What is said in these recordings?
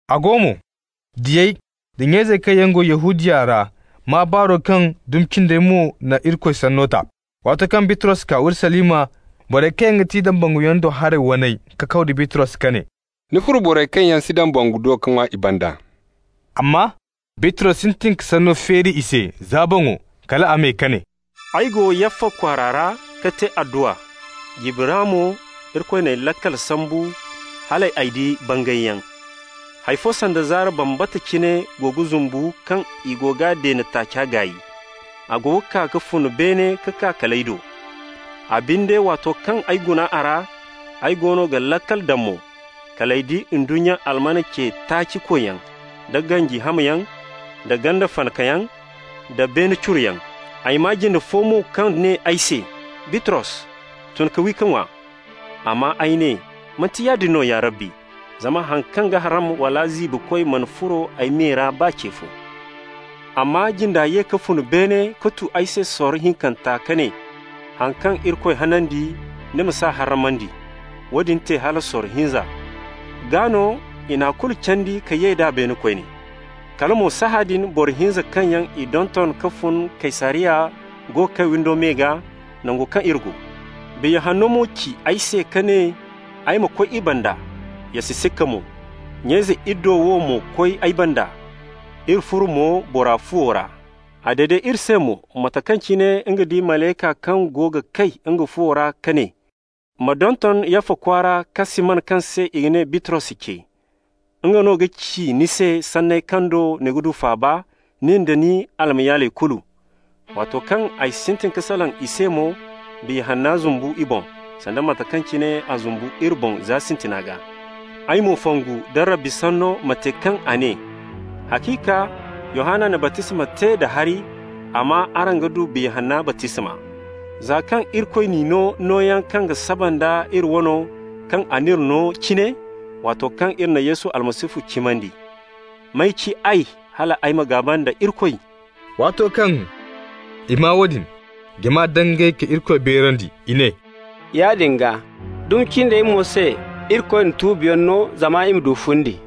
A go mo, diyey da nya-izey kaŋ yaŋ go Yahudiya ra maa baaro kaŋ dumi cindey mo na Irikoy sanno ta. Waato kaŋ Bitros kaa Urusalima, borey kaŋ yaŋ ga ti dambanguyaŋ do haray waney kakaw da Bitros ka ne: «Ni furo borey kaŋ yaŋ si dambangu do ka ŋwa i banda.» Amma Bitros sintin ka sanno feeri i se za boŋo kal a me ka ne: «Ay go Yaffa kwaara ra ka te adduwa. Jirbi ra mo Irikoy n'ay laakal sambu hal ay di bangayyaŋ. Hay fo sanda zaara bambata cine go ga zumbu kaŋ i go g'a deene taaca gaay. A go ga kaa ka fun beene ka kaa kal ay do. A binde, waato kaŋ ay guna a ra, ay goono ga laakal daŋ mo, kal ay di ndunnya alman ce-taaci-koyyaŋ, da ganji hamyaŋ, da ganda fanakayaŋ, da beene curoyaŋ. Ay maa jinde fo mo kaŋ ne ay se: ‹Bitros, tun ka wi ka ŋwa.› Amma ay ne: ‹Manti yaadin no, ya Rabbi, zama haŋ kaŋ ga harram wala ziibikoy mana furo ay me ra baa ce fo.› Amma jinda ye ka fun beene ka tu ay se sorro hinkanta ka ne: ‹Haŋ kaŋ Irikoy hanandi, ni ma s'a harramandi.› Woodin te hala sorro hinza, gaa no i n'a kulu candi ka ye d'a beene koyne. Kala mo sahãadin, boro hinza kaŋ yaŋ i donton, kaŋ fun Kaysariya, go ga kay windo me gaa, nango kaŋ iri go. Biya Hanno mo ci ay se ka ne ay ma koy i banda, ya si sikka mo. Nya-ize iddo wo mo koy ay banda. Iri furo mo bora fuwo ra. A dede iri se mo mate kaŋ cine nga di malayka kaŋ go ga kay nga fuwo ra ka ne: ‹Ma donton Yaffa kwaara ka Siman kaŋ se i ga ne Bitros ce. Nga no ga ci ni se sanney kaŋ do ni ga du faaba, nin da ni almayaaley kulu.› Waato kaŋ ay sintin ka salaŋ i se mo, Biya Hanna zumbu i boŋ, sanda mate kaŋ cine a zumbu iri boŋ za sintina gaa. Ay mo fongu nda Rabbi sanno, mate kaŋ a ne: ‹Haciika Yohanna na baptisma te da hari, amma araŋ ga du Biya Hanna baptisma.› Za kaŋ Irikoy n'i no nooyaŋ kaŋ ga saba nda iri wano kaŋ a n'iri no cine, waato kaŋ iri na Yesu Almasihu cimandi, may ci ay hal ay ma gaaba nda Irikoy?» Waato kaŋ i maa woodin, jama dangay ka Irikoy beerandi. I ne: «Yaadin gaa, dumi cindey mo se Irikoy na tuubiyaŋ no zama i ma du fundi.»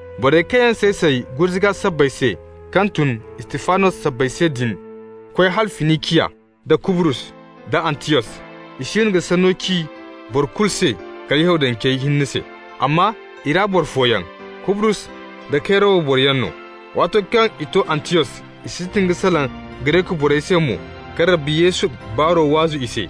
Borey kaŋ yaŋ say-say gurzuga sabbay se kaŋ tun Istifanos sabbay se din koy hala Finiciya, da Kubrus da Antiyos. I siino ga Sanno ci boro kulu se kala Yahudancey hinne se. Amma i ra boro fooyaŋ, Kubrus da Kayrawa boroyaŋ no, waato kaŋ i to Antiyos, i sintin ka salaŋ Gareku borey se mo ka Rabbi Yesu baaro waazu i se.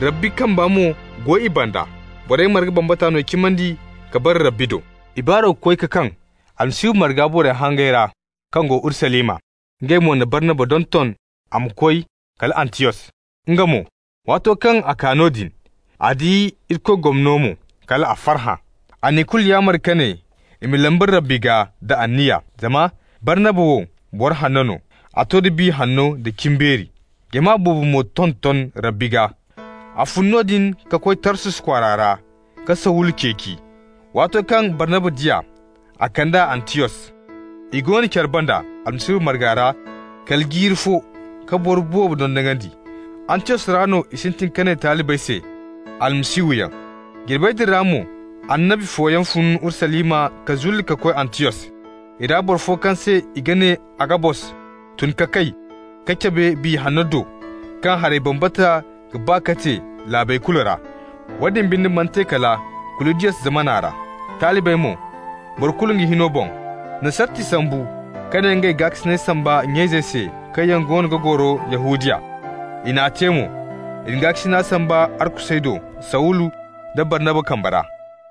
Rabbi kamba mo go i banda. Borey marga bambata no cimandi ka bare Rabbi do. I baaro koy ka kaŋ Almasihu marga borey hangey ra kaŋ go Urusalima. Ngey mo na Barnaba donton a ma koy kala Antiyos. Nga mo, waato kaŋ a kaa noodin, a di Irikoy gomno mo, kal a farhã. A n'i kulu yaamar ka ne i ma lamba Rabbi gaa da anniya. Zama Barnaba wo boro hanno no, a to da Biya Hanno da cimbeeri. Jama boobo mo tonton Rabbi gaa. A fun noodin ka koy Tarsus kwaara ka Sawulu ceeci. Waato kaŋ Barnaba di a, a kand'a Antiyos. I go no care banda Almasihu marga ra kala jiiri fo ka boro boobo dondonandi. Antiyos ra no i sintin ka ne talibey se «Almasihuyaŋ». Jirbey din ra mo annabi fooyaŋ fun Urusalima ka zulli ka koy Antiyos. I ra boro fo kaŋ se i ga ne Agabos tun ka kay ka cabe Biya Hanno do kaŋ haray bambata ga ba ka te laabey kulu ra. Woodin binde mana te kala Kuludiyos zamana ra. Talibey mo, boro kulu nga hino boŋ, na sarti sambu ka ne ngey ga gaakasinay samba nya-izey se kaŋ yaŋ goono ga goro Yahudiya. I n'a te mo. I na gaakasina samba arkusey do Sawulu nda Barnaba kambe ra.